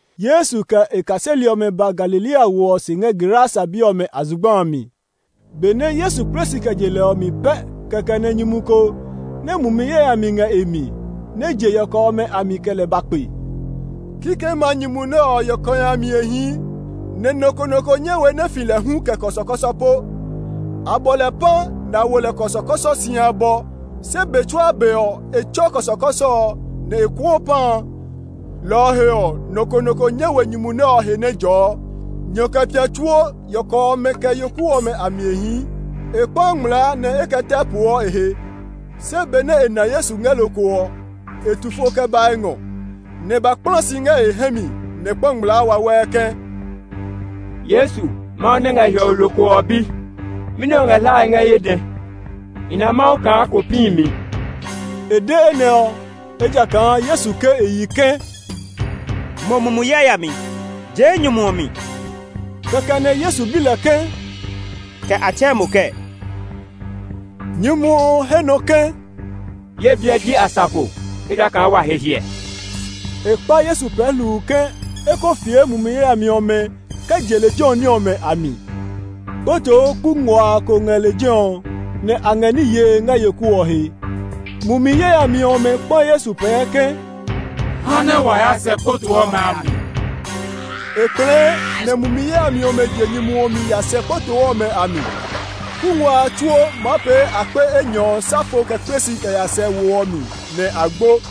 Yesu kɛ e kaseli ɔmɛ ba Galilea wo ɔ se ngɛ Gerasa bi ɔmɛ a zugba a mi. Benɛ Yesu kple si kɛ je lɛ ɔ mi pɛ kɛkɛ nɛ nyumu ko nɛ mumi yayami ngɛ e mi nɛ je yɔkɔ ɔmɛ a mi kɛ lɛ ba kpe. Kikɛmɛ a nyumu nɛ ɔ yɔkɔhi a mi e hii, nɛ nɔ ko nɔ ko nyɛ we nɛ e fi lɛ hu kɛ kɔsɔkɔsɔ po. A bɔ lɛ pã, nɛ a wo lɛ kɔsɔkɔsɔ si abɔ, se be tsuaa be ɔ, e tsɔɔ kɔsɔkɔsɔ ɔ, nɛ e kuɔɔ pã a; lɔ ɔ he ɔ, nɔ ko nɔ ko nyɛ we nyumu nɛ ɔ he nɛ e jɔɔ. Nyɔ kɛ pia tsuo yɔkɔ ɔmɛ kɛ ɔmɛ a mi e hii; e kpaa ngmlaa nɛ e kɛ tɛ poɔ e he. Se benɛ e na Yesu ngɛ lokoo ɔ, e tu fo kɛ ba e ngɔ, nɛ e ba kpla si ngɛ e hɛ mi, nɛ e kpa ngmlaa wawɛɛ ke, “Yesu, Mawu nɛ ngɛ hiɔwe lokoo ɔ bi, mɛni o ngɛ hlae ngɛ ye dɛ? I na Mawu kaa kó pĩ mi!” (E de enɛ ɔ, ejakaa Yesu ke e yi ke, “Mo mumi yayami, jee nyumu ɔ mi!”) Kɛkɛ nɛ Yesu bi lɛ ke, “Kɛ a tsɛɛ mo kɛɛ?” Nyumu ɔ he nɔ ke, “Ye biɛ ji Asafo, ejakaa wa he hiɛ.” E kpa Yesu pɛɛ hluu ke e ko fie mumi yayami ɔmɛ kɛ je lejɛ ɔ ní ɔmɛ a mi. Kpotoo kuu nguaa ko ngɛ lejɛ ɔ nɛ a ngɛ ní yee ngɛ yoku ɔ he. Mumi yayami ɔmɛ kpa Yesu pɛɛ ke, “Ha nɛ wa ya sɛ kpotoo ɔmɛ a mi.” E kplɛɛ, nɛ mumi yayami ɔmɛ je nyumu ɔ mi ya sɛ kpotoo ɔmɛ a mi. Kuu nguaa a tsuo, maa pee akpe enyɔ ɔ sa fo kɛ kple si kɛ ya sɛ wo ɔ mi, nɛ a gbo.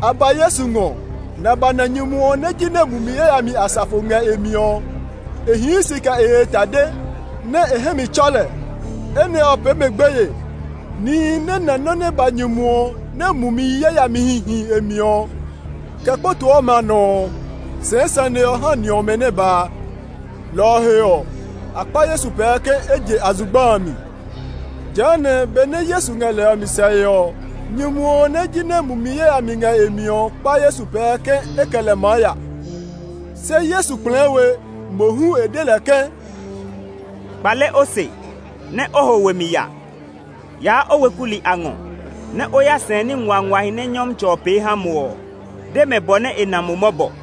A ba Yesu ngɔ, nɛ a ba na nyumu ɔ nɛ jinɛ mumi yayamihi asafo ngɛ e mi ɔ. E hii si kɛ e he tade, nɛ e hɛ mi tsɔ lɛ. Enɛ ɔ pee mɛ gbeye. Nihi nɛ na nɔ́ nɛ ba nyumu ɔ nɛ mumi yayamihi hi e mi ɔ, kɛ kpotoo ɔmɛ a nɔ ɔ, sɛɛ sane ɔ ha ni ɔmɛ nɛ ba a. Lɔ ɔ he ɔ, a kpa Yesu pɛɛ ke e je a zugba a mi. Jehanɛ benɛ Yesu ngɛ lɛ ɔ mi sɛe ɔ, nyumu ɔ nɛ jinɛ mumi yayami ngɛ e mi ɔ kpa Yesu pɛɛ ke e kɛ lɛ maa ya. Se Yesu kplɛɛ we; mohu e de lɛ ke, “Kpale o se, nɛ o ho we mi ya! Yaa o weku li a ngɔ nɛ o ya sɛɛ ní nguanguahi nɛ Nyɔmtsɛ ɔ pee ha mo ɔ; de mɛ bɔ nɛ e na mo mɔbɔ.”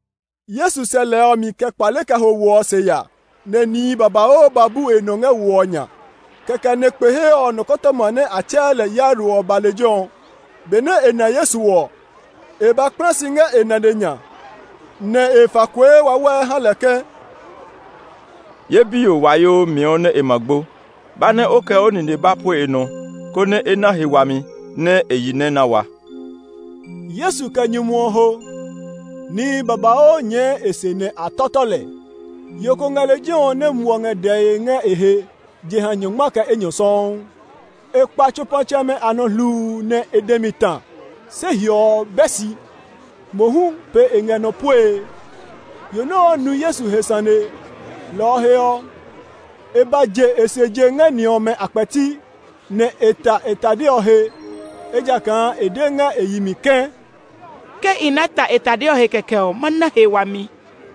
Yesu sɛ lɛ ɔ mi kɛ kpale kɛ ho wo ɔ se ya, nɛ nihi babauu ba bu e nɔ ngɛ wo ɔ nya. Kɛkɛ nɛ kpe he ɔ nɔkɔtɔma nɛ a tsɛɛ lɛ Yairo ɔ ba lejɛ ɔ. Benɛ e na Yesu ɔ, e ba kpla si ngɛ e nane nya, nɛ e fa kue wawɛɛ ha lɛ ke, “Ye biyo wayoo miɔ nɛ e ma gbo. Ba nɛ o kɛ o nine ba pue e nɔ, konɛ e na he wami, nɛ e yi nɛ na wa.” Yesu kɛ nyumu ɔ ho. Nihi babauu nyɛɛ e se nɛ a mia lɛ. Yo ko ngɛ lejɛ ɔ nɛ muɔ ngɛ dɛe ngɛ e he jeha nyɔngma kɛ enyɔ sɔuu. E kpa tsopatsɛmɛ a nɔ hluu nɛ e dɛ mi ta, se hiɔ ɔ bɛ si; mohu pe e ngɛ nɔ puee. Yo nɛ ɔ nu Yesu he sane, lɔ ɔ he ɔ, e ba je e se je ngɛ ni ɔmɛ a kpɛti, nɛ e ta e tade ɔ he. Ejakaa e de ngɛ e yi mi ke, “Ke i ná ta e tade ɔ he kɛkɛ ɔ, ma na he wami.”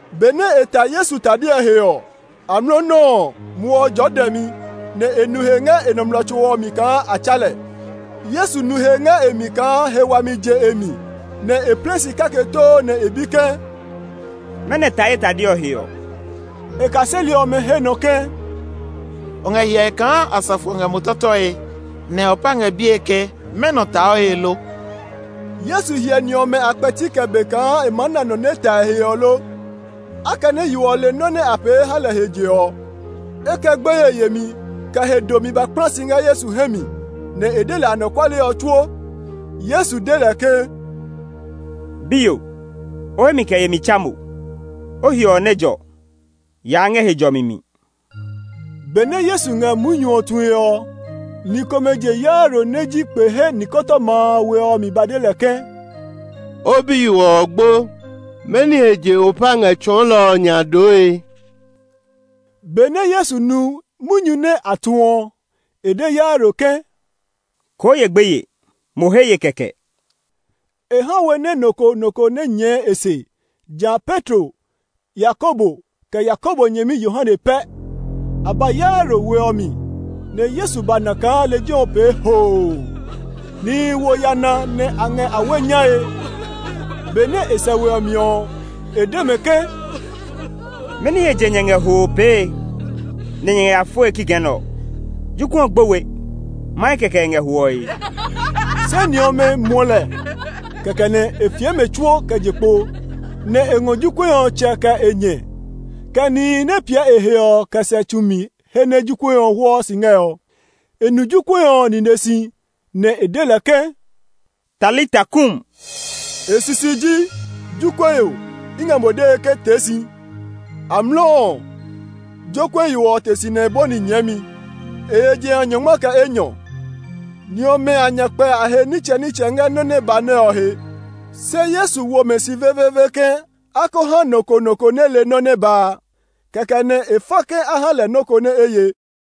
Benɛ e ta Yesu tade ɔ he ɔ, amlɔ nɔuu ɔ, muɔ ɔ jɔɔ dɛmi, nɛ e nu he ngɛ e nɔmlɔ tso ɔ mi kaa a tsa lɛ. Yesu nu he ngɛ e mi kaa he wami je e mi, nɛ e plɛ si kake too nɛ e bi ke, “Mɛnɔ ta ye tade ɔ he ɔ?” E kaseli ɔmɛ he nɔ ke, “O ngɛ hyɛe kaa asafo ɔ ngɛ mo miae, nɛ o pa ngɛ bie ke, mɛnɔ ta o he lo?” Yesu hyɛ ni ɔmɛ a kpɛti kɛ be kaa e maa na nɔ nɛ ta e he ɔ lo. Akɛnɛ yo ɔ le nɔ́ nɛ a pee ha lɛ he je ɔ, e kɛ gbeye yemi, kɛ he domi ba kpla si ngɛ Yesu hɛ mi, nɛ e de lɛ anɔkuale ɔ tsuo. Yesu de lɛ ke, “Biyo, o hemi kɛ yemi tsa mo! O hiɔ ɔ nɛ jɔ! Yaa ngɛ he jɔmi mi.” Benɛ Yesu ngɛ munyu ɔ tue ɔ, ni komɛ je Yairo nɛ ji kpe he nɔkɔtɔma a we ɔ mi ba de lɛ ke, “O biyo ɔ gbo; mɛni he je o pa ngɛ tsɔɔlɔ ɔ nya dooe?” Benɛ Yesu nu munyu nɛ a tu ɔ, e de Yairo ke, “Koo ye gbeye; mo he ye kɛkɛ!” E ha we nɛ nɔ ko nɔ ko nɛ nyɛɛ e se, ja Petro, Yakobo, kɛ Yakobo nyɛmi Yohane pɛ. A ba Yairo we ɔ mi, nɛ Yesu ba na kaa lejɛ ɔ pee hoo. Nihi wo yana nɛ a ngɛ awe nyae. Benɛ e sɛ we ɔ mi ɔ, e de mɛ ke, “Mɛni he je nyɛ ngɛ hoo pee nɛ nyɛ ngɛ ya foe kikɛ nɛ ɔ? Jokuɛ ɔ gbo we; mahe kɛkɛ e ngɛ hwɔe.” Se ni ɔmɛ muɔ lɛ. Kɛkɛ nɛ e fie mɛ tsuo kɛ je kpo, nɛ e ngɔ jokuɛ ɔ tsɛ kɛ e nyɛ, kɛ nihi nɛ piɛ e he ɔ kɛ sɛ tsu mi he nɛ jokuɛ ɔ hwɔɔ si ngɛ ɔ. E nu jokuɛ ɔ nine si, nɛ e de lɛ ke, “Talita kum.” E sisi ji, “Jokuɛ yo, i ngɛ mo dee ke tee si!” Amlɔ ɔ, jokuɛ yo ɔ te si nɛ e bɔni nyɛɛmi. (E ye jeha nyɔngma kɛ enyɔ.) Ni ɔmɛ a nya kpɛ a he nitsɛnitsɛ ngɛ nɔ nɛ ba nɛ ɔ he. Se Yesu wo mɛ si veveeve ke a ko ha nɔ ko nɔ ko nɛ le nɔ nɛ ba a. Kɛkɛ nɛ e fa ke a ha lɛ nɔ́ ko nɛ e ye.